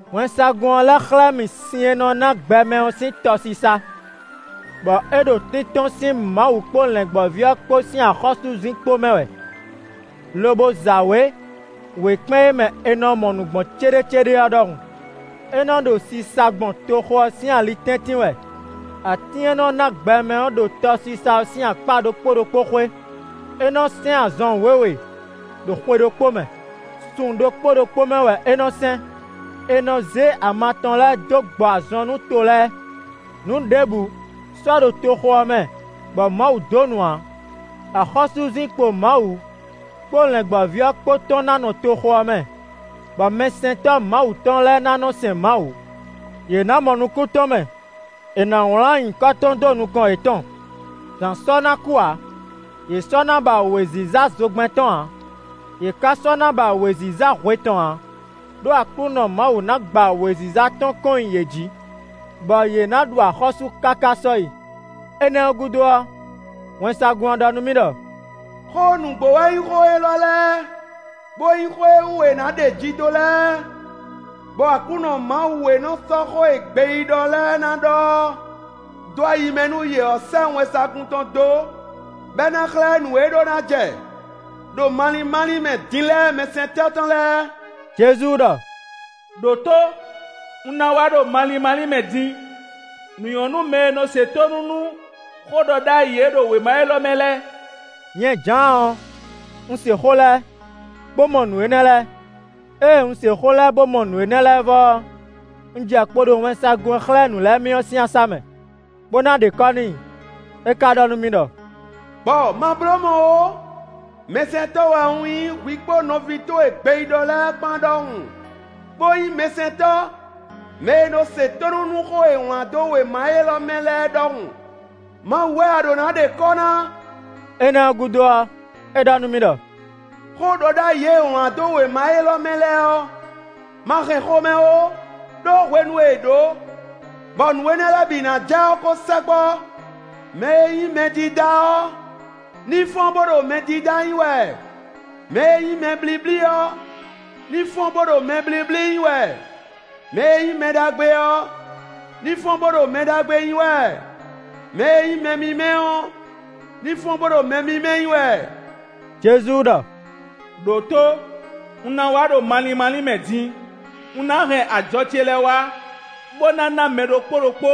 Wɛnsagun ɔ́ lɛ́ xlɛ́ mì sin e nɔ ná gbɛ mɛ ɔ́ sín tɔsisa, bɔ é ɖo tíntɔ́n sín Mawu kpó Lɛ̌ngbɔ́ví ɔ́ kpó sín axɔ́súzinkpo mɛ wɛ, lobo za wě wěkpɛ́n e mɛ è nɔ mɔ nǔ gbɔn céɖécéɖé ɔ́ ɖɔhun. É nɔ ɖo sisa gbɔn toxo ɔ́ sín ali tɛ́ntin wɛ. Atín e nɔ ná gbɛ mɛ ɔ́ ɖo tɔsisa ɔ́ sín akpá ɖokpó ɖokpó xwé; é nɔ sɛ́n azɔn wěwe ɖo xwe ɖokpó mɛ; sun ɖokpó ɖokpó mɛ wɛ é nɔ sɛ́n; è nɔ zé ama tɔn lɛ́ɛ dó gbɔ azɔn nú to lɛ́ɛ. Nǔ ɖěbǔ sɔ́ ɖo toxo ɔ́ mɛ bɔ Mawu donu ǎ. Axɔ́súzinkpo Mawu kpó Lɛ̌ngbɔ́ví ɔ́ kpó tɔn ná nɔ toxo ɔ́ mɛ, bɔ mɛsɛntɔ́ Mawu tɔn lɛ́ɛ ná nɔ sɛn Mawu. Yě ná mɔ nukún tɔn mɛ; è nǎ wlán nyǐkɔ tɔn dó nukɔn yětɔn. Zǎn sɔ́ ná nɔ kú ǎ; yě sɔ́ ná ba wěziza zogbɛ́n tɔn ǎ; yě ka sɔ́ ná ba wěziza hwe tɔn ǎ, ɖó Aklúnɔ Mawu ná gba wěziza tɔn kɔn nyi yě jí, bɔ yě ná ɖu axɔ́sú káká sɔ́yi. Énɛ́ ɔ́ gúdo ɔ́, wɛnsagun ɔ́ ɖɔ nú mì ɖɔ: “Xó nǔgbó wɛ nyí xó élɔ́ lɛ́ɛ, bó nyí xó e wú è ná ɖeji dó lɛ́ɛ. Bɔ Aklúnɔ Mawu e nɔ sɔ́ xó e gbeyíɖɔ lɛ́ɛ ná ɖɔ ɔ́ dó ayi mɛ nú yě ɔ́ sɛ́ wɛnsagun tɔn dó, bɔ é ná xlɛ́ nǔ e ɖó ná jɛ ɖo malín málín mɛ din lɛ́ɛ mɛsɛntɔ́ tɔn lɛ́ɛ.” Jezu ɖɔ: “Đǒtó! Un ná wá ɖo malín málín mɛ din! Nǔ nyɔ́ nú mɛ e nɔ se tónú nú xóɖɔɖ'ayǐ e ɖo wěma élɔ́ mɛ lɛ́ɛ.” Nyɛ Jǎan ɔ́, un se xó lɛ́ɛ, bó mɔ nǔ énɛ́ lɛ́ɛ. Ée un se xó lɛ́ɛ bó mɔ nǔ énɛ́ lɛ́ɛ vɔ ɔ́, un jɛ kpo ɖo wɛnsagun e xlɛ́ nǔ lɛ́ɛ mì ɔ́ sín asá mɛ, bó ná ɖe kɔ́ n'i. É ka ɖɔ nú mì ɖɔ: “Gbɔ, ma bló mɔ̌ ó! Mɛsɛntɔ́ wɛ un nyí hwi kpó nɔví towe gbeyíɖɔ lɛ́ɛ kpán ɖɔhun; bó nyí mɛsɛntɔ́ mɛ e nɔ se tónú nú xó e è wlán dó wěma élɔ́ mɛ lɛ́ɛ é ɖɔhun. Mawu wɛ a ɖǒ ná ɖe kɔ́ ná.” Énɛ́ ɔ́ gúdo ɔ́, é ɖɔ nú mì ɖɔ: “Xó ɖɔ ɖ'ayǐ e è wlán dó wěma élɔ́ mɛ lɛ́ɛ ɔ́, ma hɛn xomɛ ó, ɖó hwenu e è ɖǒ, bɔ nǔ énɛ́ lɛ́ɛ bǐ ná jɛ ɔ́ ko sɛkpɔ́. Mɛ e nyí mɛdídá ɔ́ ní fɔ́n bó ɖo mɛdídá nyí wɛ; mɛ e nyí mɛ blíblí ɔ́ ní fɔ́n bó ɖo mɛ blíblí nyí wɛ; mɛ e nyí mɛ ɖagbe ɔ́ ní fɔ́n bó ɖo mɛ ɖagbe nyí wɛ; mɛ e nyí mɛ mímɛ́ ɔ́ ní fɔ́n bó ɖo mɛ mímɛ́ nyí wɛ.” Jezu ɖɔ: “Đǒtó! Un ná wá ɖo malín málín mɛ din! Un ná hɛn ajɔ ce lɛ́ɛ wá, bó ná ná mɛ ɖokpó ɖokpó,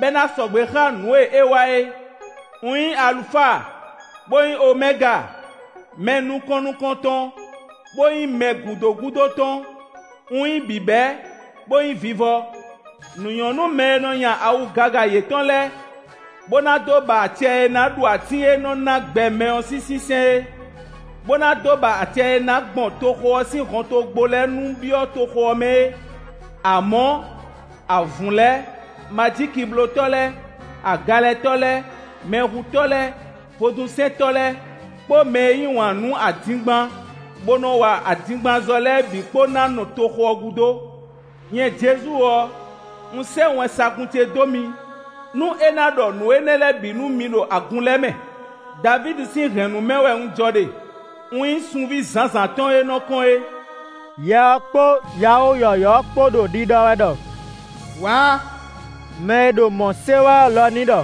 bɔ é ná sɔgbe xá nǔ e é wa é. Un nyí Alufa, bó nyí Omɛga; mɛ nukɔn nukɔntɔn, bó nyí mɛ gǔdo gúdo tɔn; un nyí bǐbɛ́, bó nyí vivɔ.” Nǔ nyɔ́ nú mɛ e nɔ nya awu gaga yětɔn lɛ́ɛ, bó ná dó ba acɛ e ná ɖu atín e nɔ ná gbɛ mɛ ɔ́ sín sínsɛ́n é; bó ná dó ba acɛ e ná gbɔn toxo ɔ́ sín hɔntogbó lɛ́ɛ nu byɔ́ toxo ɔ́ mɛ é. Amɔ̌, avǔn lɛ́ɛ, majíkiblótɔ́ lɛ́ɛ, agalɛtɔ́ lɛ́ɛ, mɛhutɔ́ lɛ́ɛ, vodúnsɛntɔ́ lɛ́ɛ, kpó mɛ e yí wǎn nú adingban, bó nɔ wa adingbanzɔ́ lɛ́ɛ bǐ kpó ná nɔ toxo ɔ́ gúdo! “Nyɛ Jezu ɔ́, un sɛ́ wɛnsagun ce dó mi, nú é ná ɖɔ nǔ énɛ́ lɛ́ɛ bǐ nú mi ɖo agun lɛ́ɛ mɛ. Davídi sín hɛ̌nnu mɛ wɛ un jɔ ɖe; un nyí sunví zǎnzǎn tɔn e nɔ kɔ́n é.” Yɛ ɔ́ kpó yawó yɔ̌yɔ́ ɔ́ kpó ɖo ɖiɖɔ wɛ ɖɔ: “Wǎ!” Mɛ e ɖo mɔ̌ se wɛ ɔ́ lɔ ní ɖɔ: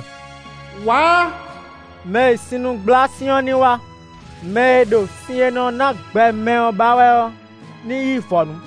“Wǎ!” Mɛ e sinnugblá sin ɔ́ ní wá; mɛ e ɖo sin e nɔ ná gbɛ mɛ ɔ́ ba wɛ ɔ́ ní yí vɔ̌nu.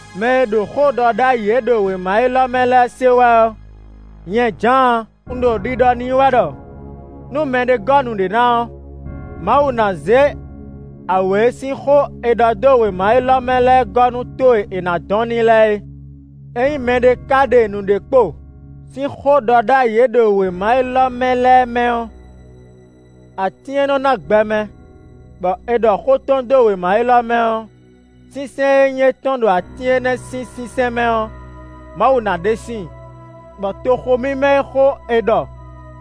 Mɛ e ɖo xóɖɔɖ'ayǐ e ɖo wěma élɔ́ mɛ lɛ́ɛ se wɛ ɔ́, nyɛ Jǎan un ɖo ɖiɖɔ n'i wɛ ɖɔ: nú mɛɖé gɔ́ nǔɖé ná ɔ́, Mawu ná zé awě e sín xó è ɖɔ dó wěma élɔ́ mɛ lɛ́ɛ gɔ́ nú tó e è nǎ dɔn n'i lɛ́ɛ é. Ényí mɛɖé ka ɖe nǔɖé kpo sín xóɖɔɖ'ayǐ e ɖo wěma élɔ́ mɛ lɛ́ɛ mɛ ɔ́, atín e nɔ ná gbɛ mɛ, bɔ è ɖɔ xó tɔn dó wěma élɔ́ mɛ ɔ́, sínsɛ́n e nyí étɔn ɖo atín énɛ́ sín sínsɛ́n mɛ ɔ́, Mawu ná ɖe síin, bɔ toxo mímɛ́ e xó è ɖɔ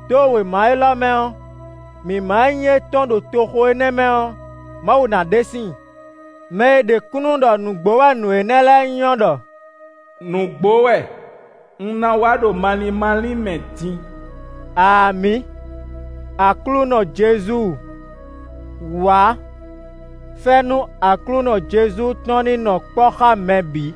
dó wěma élɔ́ mɛ ɔ́, mǐmá e nyí étɔn ɖo toxo énɛ́ mɛ ɔ́, Mawu ná ɖe síin. Mɛ e ɖe kúnnu ɖɔ nǔgbó wɛ nǔ énɛ́ lɛ́ɛ nyí ɔ́ ɖɔ: “Nǔgbó wɛ! Un ná wá ɖo malín málín mɛ din!” Amǐ! Aklúnɔ Jezu, wǎ! Fɛ́nú Aklúnɔ Jezu tɔn ní nɔ kpɔ́ xá mɛ bǐ.